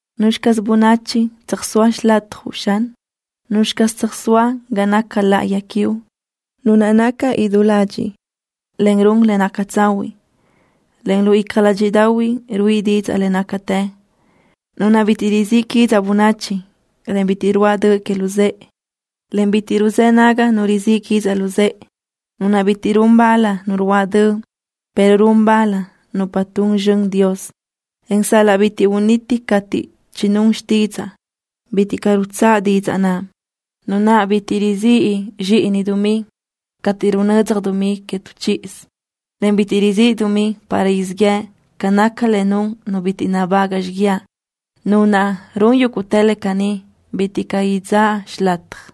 ¿Nuzxi caz bönachi tsöjsóa xilatjuʼ, Xan? ¿Nuzxi caz tsöjsóa ga naca láʼayi quiuʼ? Nu naʼ naca idú ladxiʼ, en run le naca tsahuiʼ, en lu icja ládxiʼdaʼahui ruíʼi didzaʼ le nácatë. Nu naʼ bitiʼ rizíʼ quidzaʼ bönachi, en bitiʼ ruáʼ döʼ que luzë́ʼe, en bitiʼ ruzë́ naga nu rizíʼ quidzaʼ luzë́ʼe. Nu naʼ bitiʼ run bal nu ruáʼ döʼ, pero run bal nupa tun zxön Dios, en sal-laʼ bi uniti cateʼ chinún xtidzaʼ, bitiʼ caʼ rutsáʼ didzaʼ naʼ. Nu naʼ bitiʼ rizíʼ icja dumí cateʼ runödzaj dumí que tu chíʼidoʼsö, en bitiʼ rizíʼ dumí para siʼ yëʼ ca naca le nun nu bitiʼ nabagaʼ xiguiaʼ. Nu naʼ run yúguʼtë le caní bitiʼ caʼ idzáʼ xilataj.